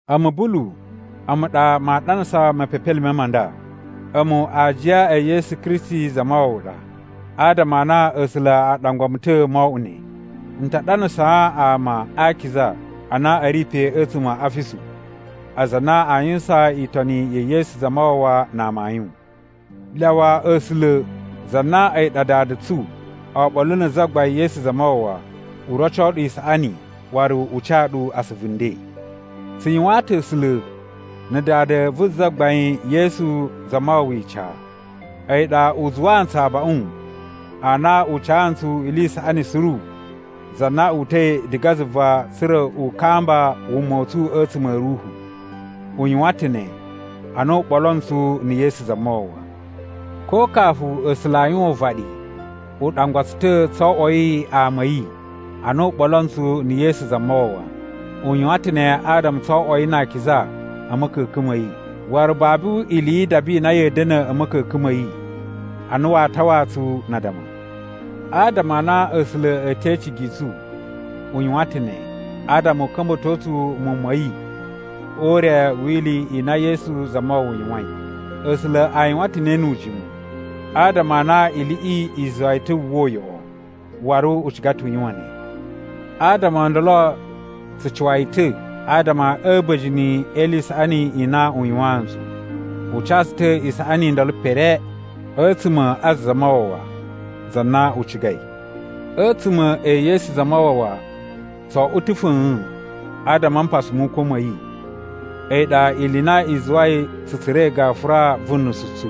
A̱mu Bulu, a̱mu ɗa maa ɗanasa mepepelime ma nda. A̱mu aajiya e Yesu Kristi Zamawawa ɗa, adama a na A̱sula̱ a ɗangwa mu ta̱ mo oꞌwo ne. N ta ɗanasaa ama a akiza a na a ri pe a̱tsuma̱ a Afisu, aza a na aa yuwusan itoni ya̱ Yesu Zamawawa na amayun. Lyawa A̱sula̱ za na a̱yi ɗa Dada tsu oɓolo na̱ Zagbain Yesu Zamawawa u roco ɗu isaꞌani waru u ca ɗu asuvu nden. Tsu yuwaan ta̱ A̱sula̱ na̱ Dada vu Zagbain Yesu Zamawawa ica. A̱yi ɗa u zuwaa ntsu abaꞌun ana u ca ntsu ili i saꞌani suru za na uta̱i diga zuva tsa̱ra̱ u kamba wuma u tsu a̱tsuma̱ a̱ ruhu. U yuwan ta̱ ne ana u ɓolo ntsu na̱ Yesu Zamawawa. Ko kafu A̱sula̱ a yuwan uvaɗi, u ɗangwa tsu ta̱ tso oꞌwoi ama a̱ yi a na u ɓolo ntsu na̱ Yesu Zamawawa. U yuwan ta̱ ne adama tso oꞌwoi na akiza a̱ ma̱ka̱ka̱n ma̱ yi, waru babu ili yi idaba i na ya̱a̱ da̱na̱ a̱ ma̱ka̱ka̱n ma̱ yi a na waa tawaa tsu na addama. Adama a na A̱sula̱ a̱ te icigi i tsu, u yuwan ta̱ ne, adama u ka̱mba̱to tsu muwun ma̱ yi o ure wi ili i na Yesu Zamawawa yuwain. A̱sula̱ a yuwan ta̱ ne nu ujimu, adama a na iliꞌi i zuwa yi ta̱ wu uwwa uyoꞌo, waru u ciga ta̱ u yuwan ne. Adama o ndolo tsu cuwa yi ta̱ adama a̱ a̱ba̱jini e ili i isaꞌani i na u yuwaan ntsu. U ca tsu ta̱ isaꞌani i ndolo pere, a̱tsuma̱ a Zamawawa, za na u cigai. A̱tsuma̱ e Yesu Zamawawa tso oꞌwo ta̱ fa̱a̱n adama a mpasa mu ukwa̱ ma̱ yi, a̱yi ɗa ili i na i zuwai tsu tsura̱i gafura vu nusu tsu.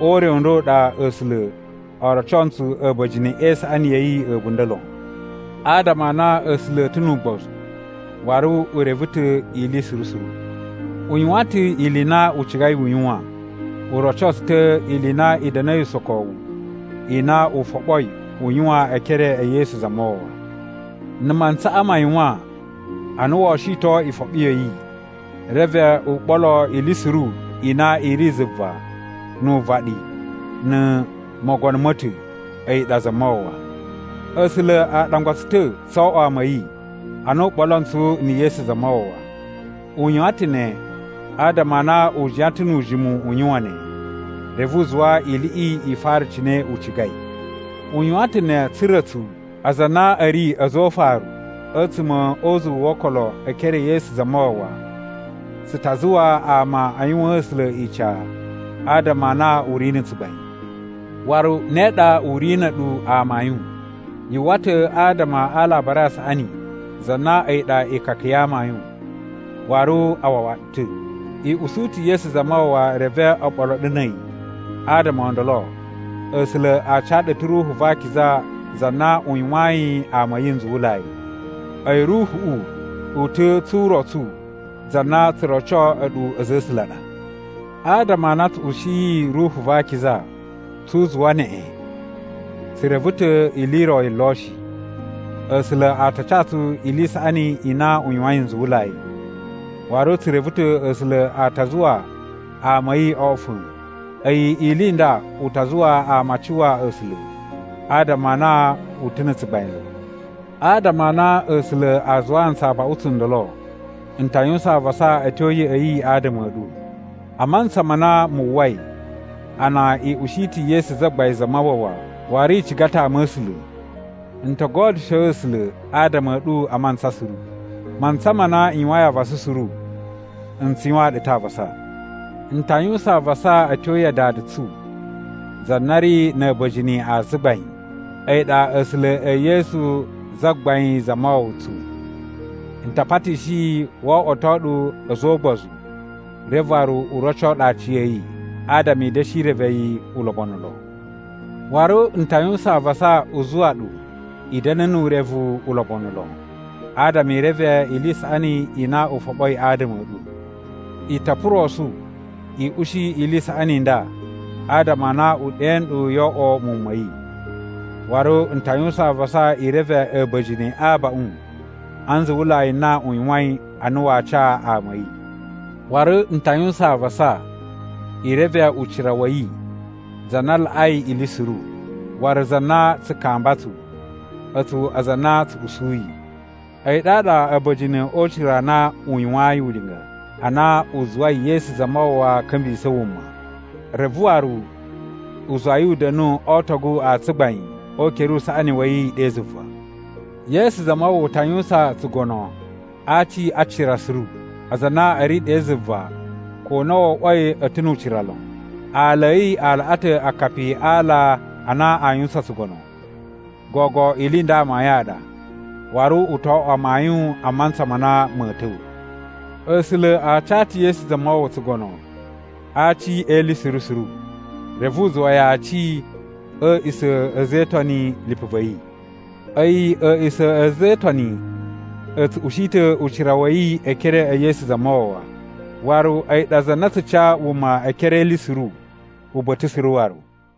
O ure u nda u ɗa A̱sula̱ o roco ntsu a̱ba̱jini e isaꞌani ya̱ yi a̱bunda̱ lon. Adama a na A̱sula̱ a̱ ta̱ nu ugbozu, waru u reve ta̱ ili suru suru, u yuwan ta̱ ili i na u cigai u yuwan. U roco tsu ta̱ ili i na i da̱na̱i usokowu i na u foɓoi u yuwan e ekere e Yesu Zamawawa. Na̱ mantsaꞌa ma yuwan a na woo shiton ifoɓi ya̱ yi, reve u ɓolo ili suru i na i ri zuva nu uvaɗi na̱ mogono ma̱ ta̱, a̱yi ɗa Zamawawa. A̱sula̱ a ɗangwa tsu ta̱ tso oꞌwo ama a̱ yi ana u ɓolo ntsu na̱ Yesu Zamawawa. U yuwan ta̱ ne adama a na u jiyan ta̱ nu ujimu u yuwan ne, reve u zuwa iliꞌi i fara cine u cigai. U yuwan ta̱ ne tsa̱ra̱ a̱tsu, aza a na a̱ ri a̱za̱ o ufaru a̱tsuma̱ o uzuwu wo okolo e ekere e Yesu Zamawawa, tsu ta zuwa ama a yuwaan A̱sula̱ ica adama a na u ri na̱ tsugbain. Waru ne ɗa u ri na̱ a̱ɗu amayun. Yu uwwa ta̱ adama a Alabari a Saꞌani za na a̱yi ɗa ikaka ya amayun, waru a wawa ɗu ta̱. I usu ta̱ Yesu Zamawawa reve o ɓolo ɗu na̱ a̱yi. Adama o ndolo, A̱sula̱ a ca ɗu ta̱ Ruhu va Akiza za na u yuwayin ama a̱ yi nzuwulai. A̱yi Ruhuꞌu, u ta̱ tsu urotsu za na tsu roco a̱ɗu a̱za̱ a̱ A̱sula̱ a ɗa. Adama a na tsu ushiyi Ruhu va Akiza tsu uzuwa neꞌen, tsu reve ta̱ ili i ro yi lo shi, A̱sula̱ a ta ca tsu ili i saꞌani i na u yuwain nzuwulai. Waru tsu reve ta̱ A̱sula̱ a ta zuwa ama a̱ yi oꞌwo fa̱a̱n. A̱yi ili i nda u ta zuwa ama a cuwa A̱sula̱ adama a na u ta̱ na̱ tsugbain lon. Adama a na A̱sula̱ a zuwaa ntsu abaꞌun tsundolo, n ta yuwusan avasa a̱ tyo ya̱ꞌa̱ yi adama a̱ ɗu. A mantsa ma na mu uwwai a na i ushi ta̱ Yesu Zagbain Zamawawa, waru i ciga ta̱ ama a̱ A̱sula̱, n to godyusho A̱sula̱ adama a̱ ɗu a mantsa suru. Mantsa ma na n yuwain avasa suru, n tsu yuwaan ɗu ta̱ avasa. N ta yuwusan avasa a̱ tyo ya Dada tsu za na ri na̱ a̱ba̱jini a tsugbain. A̱yi ɗa A̱sula̱ e Yesu Zagbain Zamawawa tsu. N ta patishi yi wo oꞌwoto ɗu a̱za̱ o ugbozu reve waru u roco ɗu aciya̱yi, adama i da̱shi reve yi ulobonu lon. Waru n ta yuwusan avasa u zuwa ɗu i da̱na̱ nu urevu ulobonu lon, adama i reve ili i saꞌani i na u foɓoi adama a̱ ɗu. I to purosu i ushi ili i saꞌani i nda adama a na u ɗe nɗu yo oꞌwo muwun ma̱ yi. Waru n ta yuwusan avasa i reve a̱ba̱jini a abaꞌun a nzuwulai a na u yuwain a na waa ca ama a̱ yi. Waru n ta yuwusan avasa i reve ucira wa̱ yi, za na laꞌai ili suru, waru za na tsu kamba tsu, a̱tsu aza a na tsu usuyi. A̱yi ɗaɗa a̱ba̱jini o ucira a na u yuwayin ulinga ana u zuwai Yesu Zamawawa ka̱mbisa̱ wuma, reve waru u zuwa yi u da̱nu o ootogu a tsugbain o ukere usaꞌani wa̱ yi ɗe zuva. Yesu Zamawawa ta yuwusan tsugono a aci a cira suru, aza a na a̱ ri ɗe zuva ko na wo oꞌwoi a̱ ta̱ nu ucira lon. Aala a̱ yi a laꞌa ta̱ akapi a ala a na aa yuwusan tsugono. Gogo ili i nda amayun a ɗa, waru u to oꞌwo amayun a mantsa ma na ma̱a̱ ta̱wa̱. A̱sula̱ a ca ta̱ Yesu Zamawawa tsugono a aci e ili suru suru, reve u zuwa yi aci a̱ a̱a̱ꞌisa̱ a̱ a̱za̱ e Itoni, lipu va̱ yi. A̱yi a̱a̱ꞌisa̱ a̱ a̱za̱ e Itoni a̱ tsu ushi ta̱ ucira wa̱ yi e ekere e Yesu Zamawawa, waru a̱yi ɗa za na tsu ca wuma e ekere e ili suru uba̱ta̱ suru waru.